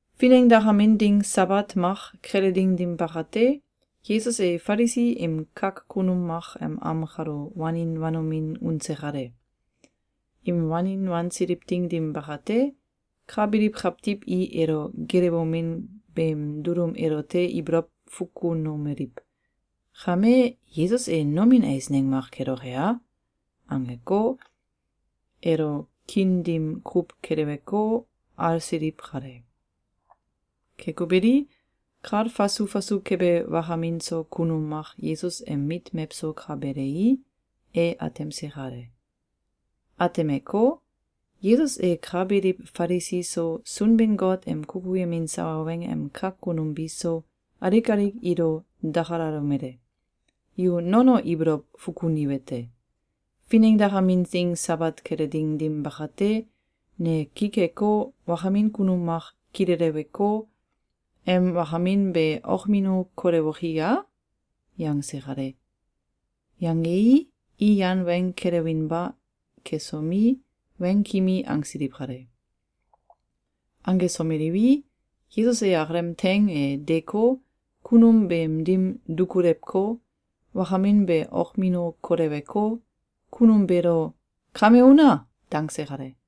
Finengdakamin ding Sabat mak kele ding dim bakate, Yesus e Falisi im kak kunum mak em am kalo wanin wanomin unse kale. Im wanin wansiliw ding dim bakate, ka biliw kawtiw i elo geelewomin beem dulum elote ibolow fukunomeliw: “Kame, Yesus e nomin eisneng mak keloke a?”, angeko, elo kiin dim kuw keleweko, alsiliw kale. Keko beli, kal fasu fasu kebe wakamin so kunum mak Yesus em mit mewso ka belei, e atemse kale. Atemeko, Yesus e ka biliw Falisi so, Sunbin-Got em kukuyemin sawa weng em kak kunum biso, alik alik ilo dakalalomele: “Yu nono ibolow fukuniwete: Finengdakamin ding Sabat kele ding dim bakate, ne ki keko, wakamin kunum mak kileleweko, em wakamin be okmino kolewoki ya?”, yangse kale. Yangei, i yan weng kelewinba kesomi, weng kimi angsiliw kale. Angesomeliwi, Yesus e akalem teing e deeko, kunum beem dim dukulewko, wakamin be okmino koleweko, kunum beelo “Kame una!”, dangse kale.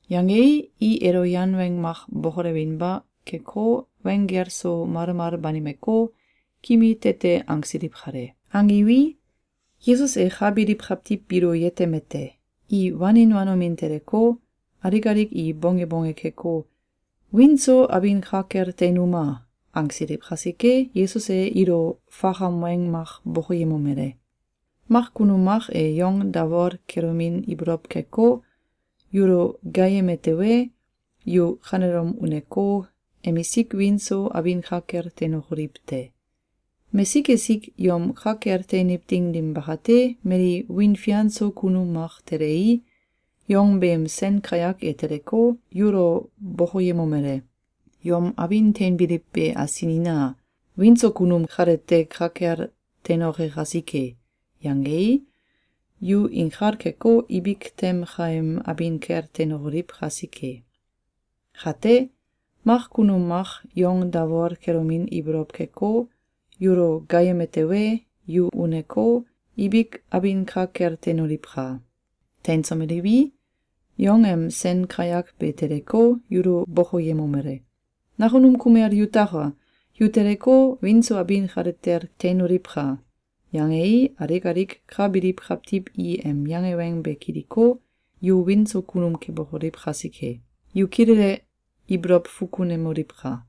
Yangei, i elo yan weng mak bokolewinba keko, weng gel so malmal banimeko, kimi tete angsiliw kale. Angiwi, Yesus e ka biliw kawtiw biilo yetemete: I wanin wanomin teleko, alik alik i bonge bonge keko, “Wiin so abin ka kel teinuma!”, angsiliw kasike, Yesus e ilo fakam weng mak bokoyemomele: “Mak kunum mak e yong dawol kelomin ibolow keko, yulo gaayeme tewe, yu kanelom uneko, emisik wiin so abin ka kel teinokoliw te! Mesik esik yom ka kel teiniw ding dim bakate, mali wiin fian so kunum mak telei, yong beem sen kayak e teleko, yulo bokoyemomele: ‘Yom abin teinbiliw be asinina! Wiin so kunum kalete ka kel teinoke kasike!’, yangei, yu inkal keko, ibik tem kaem abin kel teinokoliw kasike. Kate, mak kunum mak yong dawol kelomin ibolow keko, yulo gaayeme tewe, yu uneko, ibik abin ka kel teinoliwka! Teinsomeliwi, yong em sen kayak be teleko, yulo bokoyemomele: ‘Nakunum kumel yutaka! Yu teleko, wiin so abin kale kel teinoliwka!’, yangei, alik alik ka biliw kawtiw i em yange weng be kiliko, yu wiin so kunum kebokoliw kasike. Yu kilele ibolow fukunemoliwka!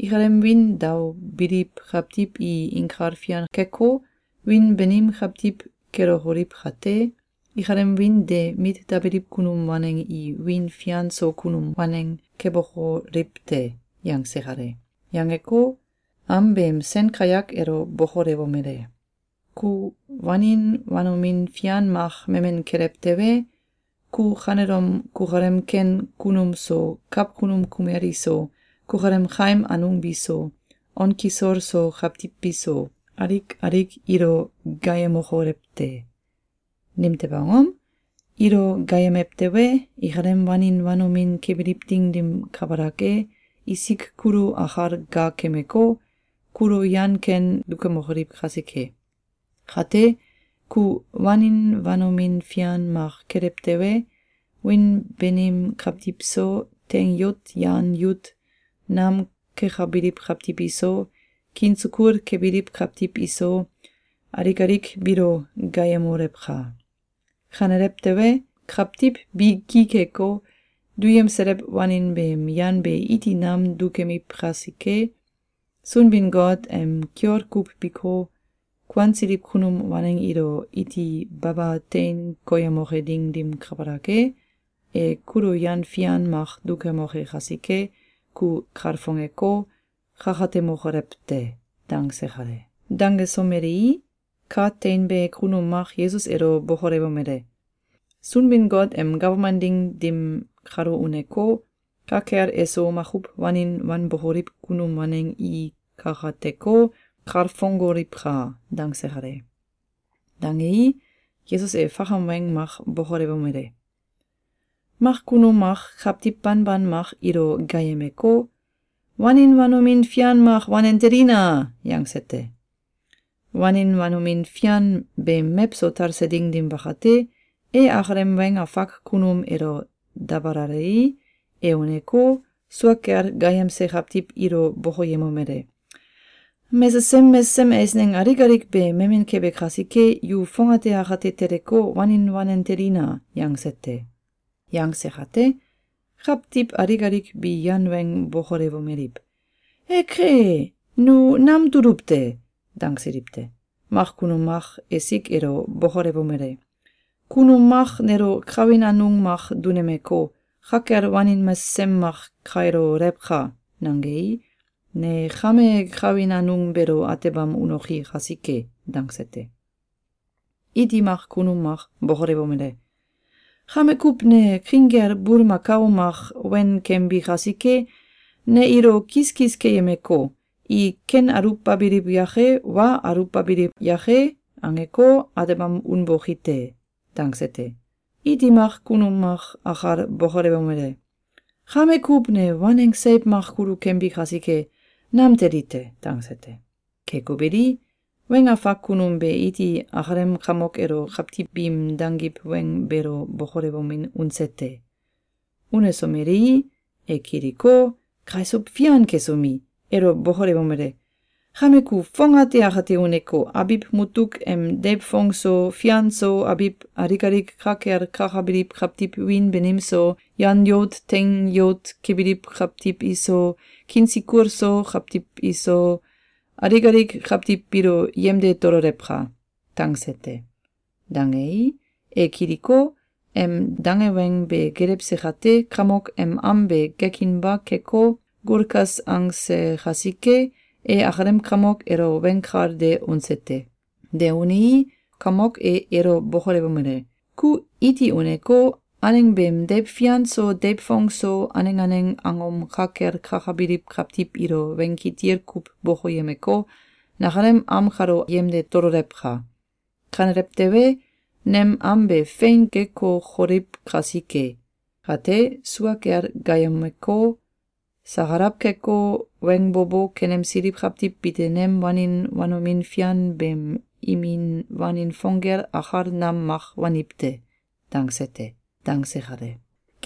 Ikalem wiin daobiliw kawtiw i inkal fian keko, wiin banim kawtiw kelokoliw kate, ikalem wiin de mit dabiliw kunum waneng i wiin fian so kunum waneng kebokoliw te.”, yangse kale. Yangeko, am beem sen kayak elo bokolewomele: “Ku wanin wanomin fian mak memen kelew tewe, ku kanelom kukalem ken kunum so, kawkunum kumel iso, kukalem kaim anung biso, on kisol so kawtiw biso, alik alik ilo gaayemokolew te! Nimtew angom? Ilo gaayemew tewe, ikalem wanin wanomin kebiliw ding dim kabalak e, isik kulo akal gaakemeko, kulo yan ken dukemokoliw kasike. Kate, ku wanin wanomin fian mak kelew tewe, wiin banim kawtiw so, teing yout yan yout nam kekabiliw kawtiw iso, kiin sukul kebiliw kawtiw iso, alik alik biilo gaayemolewka! Kanelew tewe, kawtiw bi ki keko, duyemselew wanin beem yan be iti nam dukemiw kasike, Sunbin-Got em kiol kuw biko, kuansiliw kunum waneng ilo iti baba tein koyemoke ding dim kabalak e, e kulo yan fian mak dukemoke kasike, ku kalfongeko, kakatemokolew te.”, dangse kale. Dangesomelei, ka teinbe kunum mak Yesus elo bokolewomele: “Sunbin-Got em gawman ding dim kalo uneko, ka kel eso makuw wanin wanbokoliw kunum waneng i kakateko, kalfongoliwka!”, dangse kale. Dangei, Yesus e fakam weng mak bokolewomele: “Mak kunum mak kawtiw banban mak ilo gaayemeko, ‘Wanin wanomin fian mak wanen telina!’, yangse te. Wanin wanomin fian beem mewso talse ding dim bakate, e akalem weng afak kunum elo dabalalei, e uneko, sua kel gaayemse kawtiw ilo bokoyemomele: ‘Mesesem mesesem eisneng alik alik be memen kebe kasike, yu fongate akate teleko, wanin wanen telina!’, yangse te. Yangse kate, kawtiw alik alik bi yan weng bokolewomeliw: ‘Eke! Nu nam tuluw te!’, dangsiliw te. Mak kunum mak esik elo bokolewomele: ‘Kunum mak nelo kawin anung mak dunemeko, ‘Ka kel wanin mesesem mak kailolewka!’, nangei, ne kame kawin anung beelo atebam unoki kasike.’, dangse te. Iti mak kunum mak bokolewomele: ‘Kame kuw ne king kel bulmakao mak wen kembi kasike, ne ilo kiskis keyemeko, i ‘Ken aluwbabiliw yake, wa aluwbabiliw yake?’, angeko, atebam unboki te!’, dangse te. Iti mak kunum mak akal bokolewomele: ‘Kame kuw ne waneng seiw mak kulu kembi kasike, nam teli te!’, dangse te. Keko beli, weng afak kunum be iti akalem kamok elo kawtiw biim dangiw weng beelo bokolewomin unse te. Unesomelei, e kiliko, kaisuw fian kesomi, elo bokolewomele: ‘Kame ku fongate akate uneko, abiw mutuk em deiw fong so, fian so, abiw alik alik ka kel kakabiliw kawtiw wiin banim so, yan yout teing yout kebiliw kawtiw iso, kiin sukul so kawtiw iso, alik alik kawtiw biilo yemde tololewka!’, dangse te. Dangei, e kiliko, em dange weng be gelewse kate, kamok em am be gekinba keko, gulkas angse kasike, e akalem kamok elo weng kal de unse te. De unei, kamok e elo bokolewomele: ‘Ku iti uneko, aneng beem deiw fian so, deiw fong so, aneng aneng angom ka kel kakabiliw kawtiw ilo weng kitil kuw bokoyemeko, nakalem am kalo yemde tololewka! Kanelew tewe, nem am be fein gekokoliw kasike. Kate, sua kel gaayemeko, sakalaw keko, weng bo bo kenemsiliw kawtiw bite nem wanin wanomin fian beem imin wanin fong gel akal nam mak waniw te!’, dangse te.”, dangse kale.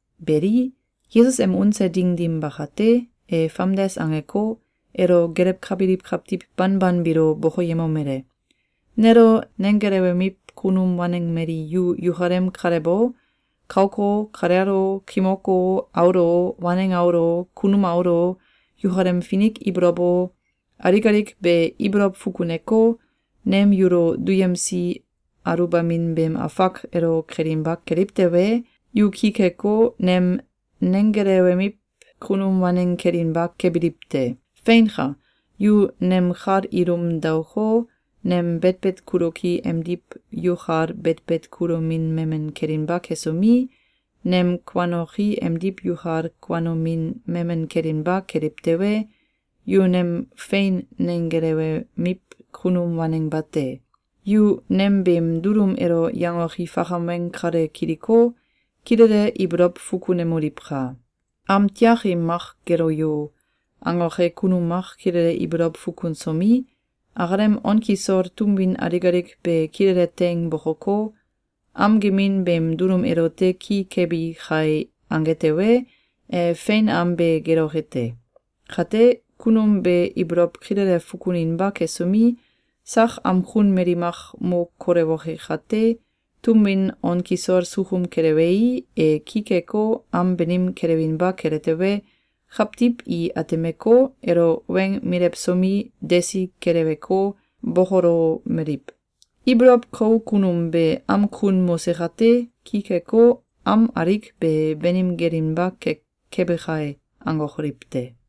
Beli, Yesus em unse ding dim bakate, e famdes angeko, elo gelewkabiliw kawtiw banban biilo bokoyemomele: “Nelo nenggelewemiw kunum waneng mali yu yukalem kalew o, kauk o, kalel o, kimok o, aul o, waneng aul o, kunum aul o, yukalem finik ibolow o, alik alik be ibolow fukuneko, nem yulo duyemsi aluwbamin beem afak elo kelinba keliw tewe, yu ki keko, nem nenggelewemiw kunum waneng kelinba kebiliw te. Feinka! Yu nem kal ilum daoko, nem betbet kuloki emdiw yukal betbet kulomin memen kelinba kesomi, nem kuanoki emdiw yukal kuanomin memen kelinba keliw tewe, yu nem fein nenggelewemiw kunum waneng bate. Yu nem beem dulum elo yangoki fakam weng kale kiliko, kilele ibolow fukunemoliwka! ‘Am tiakim mak gelo yo!’, angoke kunum mak kilele ibolow fukunsomi, akalem on kisol tum win alik alik be kilele teing bokoko, ‘Am gemin beem dulum elote ki kebi kai!’, ange tewe, e fein am be geloke te. Kate, kunum be ibolow kilele fukuninba kesomi, sak am kun mali mak mo kolewoke kate, tum win on kisol sukum kelewei, e ki keko, am banim kelewinba kele tewe, kawtiw i atemeko, elo weng milewsomi, desi keleweko, bokolomeliw: ‘Ibolow kou kunum be am kun mose kate, ki keko, am alik be banim gelinba kebe kai!’, angokoliw te.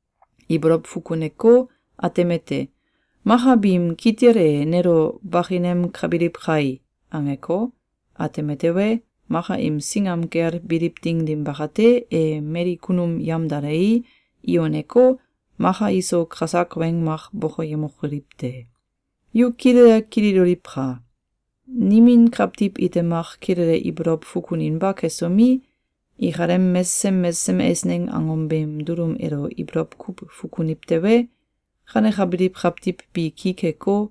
Ibolow fukuneko, atemete: ‘Maka biim kitil e nelo bakinemkabiliw kai!’, angeko, ateme tewe, maka im singam kel biliw ding dim bakate, e mali kunum yamdalei, i uneko, maka iso kasak weng mak bokoyemokoliw te. Yu kilele kililoliwka! Nimin kawtiw ite mak kilele ibolow fukuninba kesomi, ikalem mesesem mesesem eisneng angom beem dulum elo ibolow kuw fukuniw tewe, kanekabiliw kawtiw bi ki keko,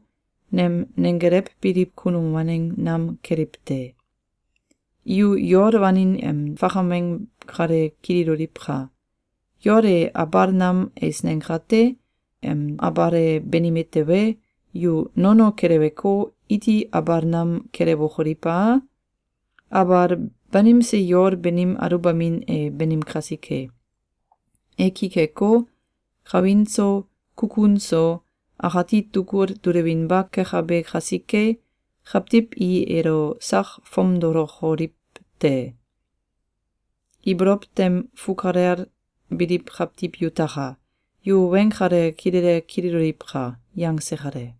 nem neggelewbiliw kunum waneng nam keliw te. Yu yol wanin em fakam weng kale kililoliwka! Yol e abal nam eisneng kate, em abal e banime tewe, yu nono keleweko, iti abal nam kelewokoliw a? Abal banimse yol beem aluwbamin e banim kasike. E ki keko, kawin so, kukun so, akati tugul dulewinba kekabe kasike, kawtiw i elo sak fomdolokoliw te. Ibolow tem fukalel biliw kawtiw yutaka! Yu weng kale kilele kililoliwka!”, yangse kale.